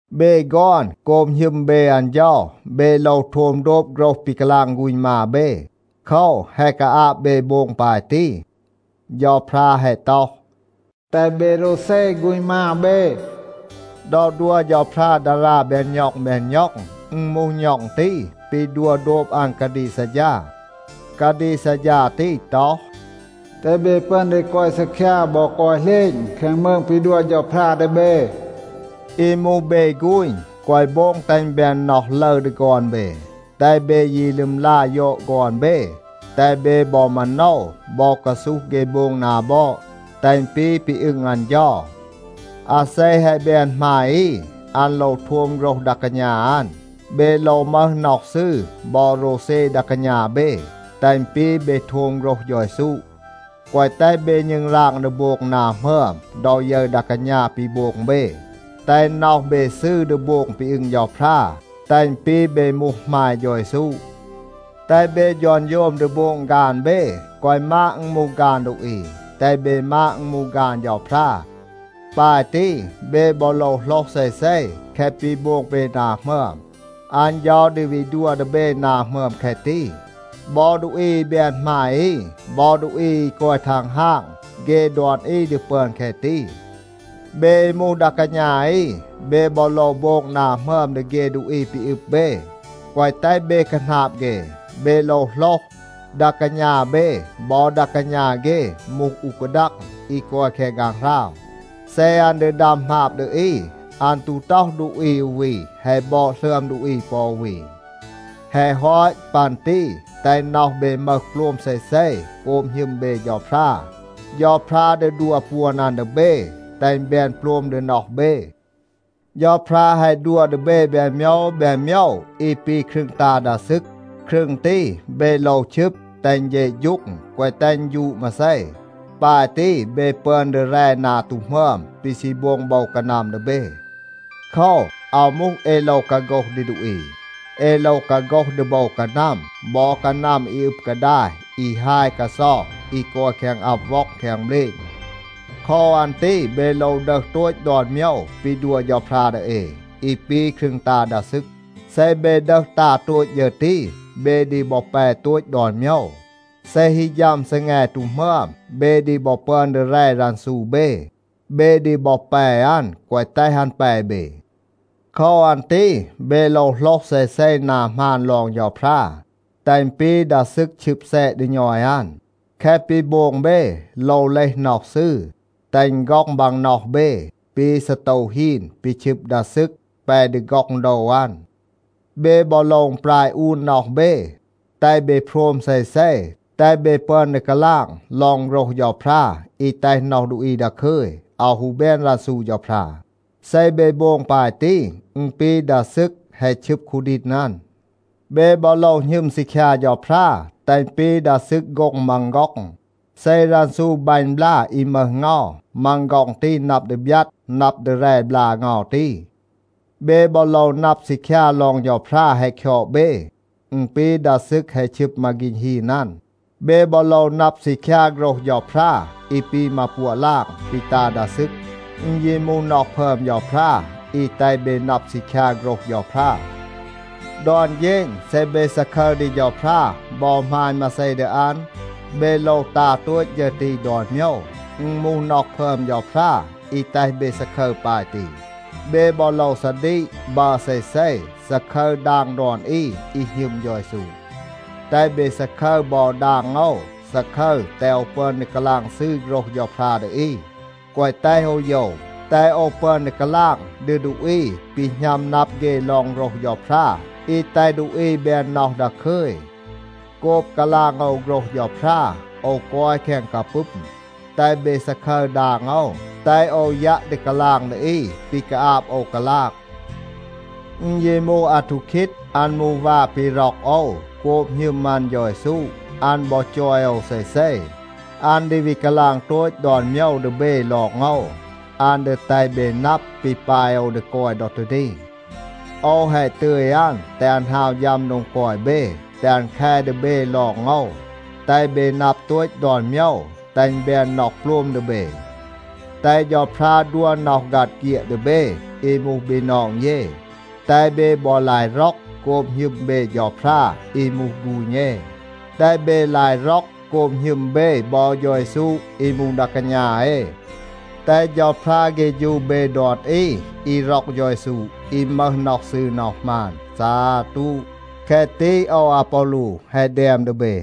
เบ ฆอน, โกบ หณึม เบ อัน เฌา, เบ โลว โทม โดบ โฆรห ปี กาลาง ฆูณ มา เบ. โคว, แฮะ กาอาบ เบ โบง ปาย ตี. เฌาพรา แฮะ ต็อห, “แตห เบ โรวเซ ฆูณ มา เบ.” ดอ ดัว เฌาพรา ดารา แบน ณ็อง แบน ณ็อง, อึณ มูห ณ็อง ตี ปี ดัว โดบ อัน กาดีก ซัดฌา. กาดีก ซัดฌา ตี ต็อห, “แตห เบ ปึอน ดี กอย ซีคยา บอ กอย เหลณ แคง มืง ปี ดัว เฌาพรา ดี เบ.” อี มูห เบ ฆูณ, แกวะ โบง แตห อึณ แบน น็อห ลึร ดี ฆอน เบ. แตห เบ ยี ลึมลา ยอด ฆอน เบ, แตห เบ บอ มาโนว บอ กาซูห เฆ โบง นา บอด, แตห อึณ ปี ปี อึง อัน เฌา. อาเซ แฮะ แบน หมาย อี, อัน โลว โทม โฆรห ดา กาณา อัน. เบ โลว มึห น็อห ซืร บอ โรวเซ ดา กาณา เบ, แตห อึณ ปี เบ โทม โฆรห เฌา เยซู. แกวะ แตห เบ ณึงราง ดี โบง นา หมึอม ดอ ยึร ดา กาณา ปี โบง เบ. แตห น็อห เบ ซืร ดี โบง ปี อึง เฌาพรา. แตห อึณ ปี เบ มูห หมาย เฌา เยซู. แตห เบ ฌอนโฌม ดี โบง ฆาน เบ. แกวะ มาด อึณ มูห ฆาน ดูอี, แตห เบ มาด อึณ มูห ฆาน เฌาพรา. ปาย ตี เบ บอ โลว โหลห เซเซ, แคะ ปี โบง เบ นา หมึอม, อัน เฌา ดี วี ดัว ดี เบ นา หมึอม แคะ ตี. บอ ดูอี อี แบน หมาย อี, บอ ดูอี อี กอย ทังฮาง, เฆ ดอน อี ดี ปึอน แคะ ตี. เบ อี มูห ดา กาณา อี, เบ บอ โลว โบง นา หมึอม ดี เฆ ดูอี ปี อึบ เบ, แกวะ แตห เบ คาหนาบ เฆ. เบ โลว โหลห, ดา กาณา เบ บอ ดา กาณา เฆ มูห อู กาดัง อี กอย แคง ฆางหราว. เซ อัน ดี ดัม หมาบ ดี อี, อัน ตู ต็อห ดูอี อู วี แฮะ บอด หลึอม ดูอี ปอ อู วี. แฮะ ฮอต ปัน ตี แตห น็อห เบ มึห โปลม เซเซ โกบ หณึม เบ เฌาพรา. เฌาพรา ดี ดัว ปวน อัน ดี เบ, แตห อึณ แบน โปลม ดี น็อห เบ. เฌาพรา แฮะ ดัว ดี เบ แบน โมยว แบน โมยว อี ปี ครึง ตา ดา ซึก. ครึง ตี เบ โลว ชึบ, แตห อึณ เฌะฌูง, แกวะ แตห อึณ ฌูด มาเซ. ปาย ตี, เบ ปึอน ดี แร นา ตู หมึอม ปี ซี โบง โบว กานัม ดี เบ. โคว, อาว มูห เอ โลว กาโฆห ดี ดูอี, เอ โลว กาโฆห ดี โบว กานัม บอ กานัม อี อึบ กาดาย อี ฮาย กาเซา, อี กอย แคง อับ ว็อง แคง เบลณ. โคว อัน ตี เบ โลว ดึห โตต ดอน โมยว ปี ดัว เฌาพรา ดี เอ, อี ปี ครึง ตา ดา ซึก. เซ เบ ดึห ตา โตต ฌึร ตี, เบ ดี บอ แป โตต ดอน โมยว. เซ ฮี ฌัม ซีแง ตู หมึอม, เบ ดี บอ ปึอน ดี แร รันซู เบ. เบ ดี บอ แป อัน, แกวะ แตห อัน แป เบ. โคว อัน ตี เบ โลว โหลห เซเซ นา หมาน ลอง เฌาพรา, แตห อึณ ปี ดา ซึก ชึบ แซะ ดี ณอย อัน. แคะ ปี โบง เบ โลว เลห น็อห ซืร, แตห อึณ ฆ็อง บาง น็อห เบ ปี ซีโตว ฮีน ปี ชึบ ดา ซึก แป ดี ฆ็อง โดว อัน. เบ บอ โลว อึณปราย อูน น็อห เบ, แตห เบ โพรม เซเซ, แตห เบ ปึอน ดี กาลาง ลอง โฆรห เฌาพรา อี แตห น็อห ดูอี ดาคึย, อาว ฮู แบน รันซู เฌาพรา. เซ เบ โบง ปาย ตี, อึณ ปี ดา ซึก แฮะ ชึบ คูดีณ อัน. เบ บอ โลว หณึม ซีคยา เฌาพรา, แตห อึณ ปี ดา ซึก โฆ็ง มัง ฆ็อง. เซ รันซู บัณ บลา อี มึห เงา, มัง ฆ็อง ตี นับ ดี บยัด นับ ดี แร บลา เงา ตี. เบ บอ โลว นับ ซีคยา ลอง เฌาพรา แฮะ คยอด เบ. อึณ ปี ดา ซึก แฮะ ชึบ มาฆีณ ฮีน อัน. เบ บอ โลว นับ ซีคยา โฆรห เฌาพรา อี ปี มาปัวะ ลาง ปี ตา ดา ซึก. อึณ ยี มูห น็อห พึอม เฌาพรา อี แตห เบ นับ ซีคยา โฆรห เฌาพรา. ดอน เฌณ เซ เบ ซาคึร ดี เฌาพรา บอ หมาณ มาเซ ดี อัน, เบ โลว ตา โตต ฌึร ตี ดอน โมยว. อึณ มูห น็อห พึอม เฌาพรา อี แตห เบ ซาคึร ปาย ตี. เบ บอ โลว ซาดีก, บัร เซเซ, ซาคึร ดาง ดอน อี, อี หณึม เฌา เยซู. แตห เบ ซาคึร บอ ดาง โอว. ซาคึร, แตห โอว ปึอน ดี กาลาง ซืร โฆรห เฌาพรา ดี อี, แกวะ แตห โอว โยว, แตห โอว ปึอน ดี กาลาง ดี ดูอี ปี หณัม นับ เฆ ลอง โฆรห เฌาพรา อี แตห ดูอี แบน น็อห ดาคึย. โกบ กาลาง โอว โฆรห เฌาพรา, โอว กอย แคง กาปึม. แตห เบ ซาคึร ดาง โอว, แตห โอว ยัะ ดี กาลาง ดี อี ปี กาอาบ โอว กาลาง. อึณ ยี มูห อาทูคีด, อัน มูห วา ปี ร็อก โอว โกบ หณึม อัน เฌา เยซู. อัน บอ จอย โอว เซเซ. อัน ดี วี กาลาง โตต ดอน โมยว ดี เบ ลอง โอว. อัน ดี แตห เบ นับ ปี ปาย โอว ดี กอย ดอ ตี นี. โอว แฮะ ตึย อัน, แตห อัน ฮาว ฌัม โดง กอย เบ, แตห อัน แค ดี เบ ลอง โอว, แตห เบ นับ โตต ดอน โมยว, แตห อึณ แบน น็อห โปลม ดี เบ. แตห เฌาพรา ดัว น็อห ฆัด เฆียด ดี เบ อี มูห บีนอง เย. แตห เบ บอ ลาย ร็อก โกบ หณึม เบ เฌาพรา อี มูห ฆูณ เอ. แตห เบ ลาย ร็อก โกบ หณึม เบ บอ เฌา เยซู อี มูห ดา กาณา เอ. แตห เฌาพรา เฆฌู เบ ดอน อี, อี ร็อก เฌา เยซู, อี มึห น็อห ซืร, น็อห หมาน. ซาตู. แคะ ตี โอว อาปอลู แฮะ แดม ดี เบ.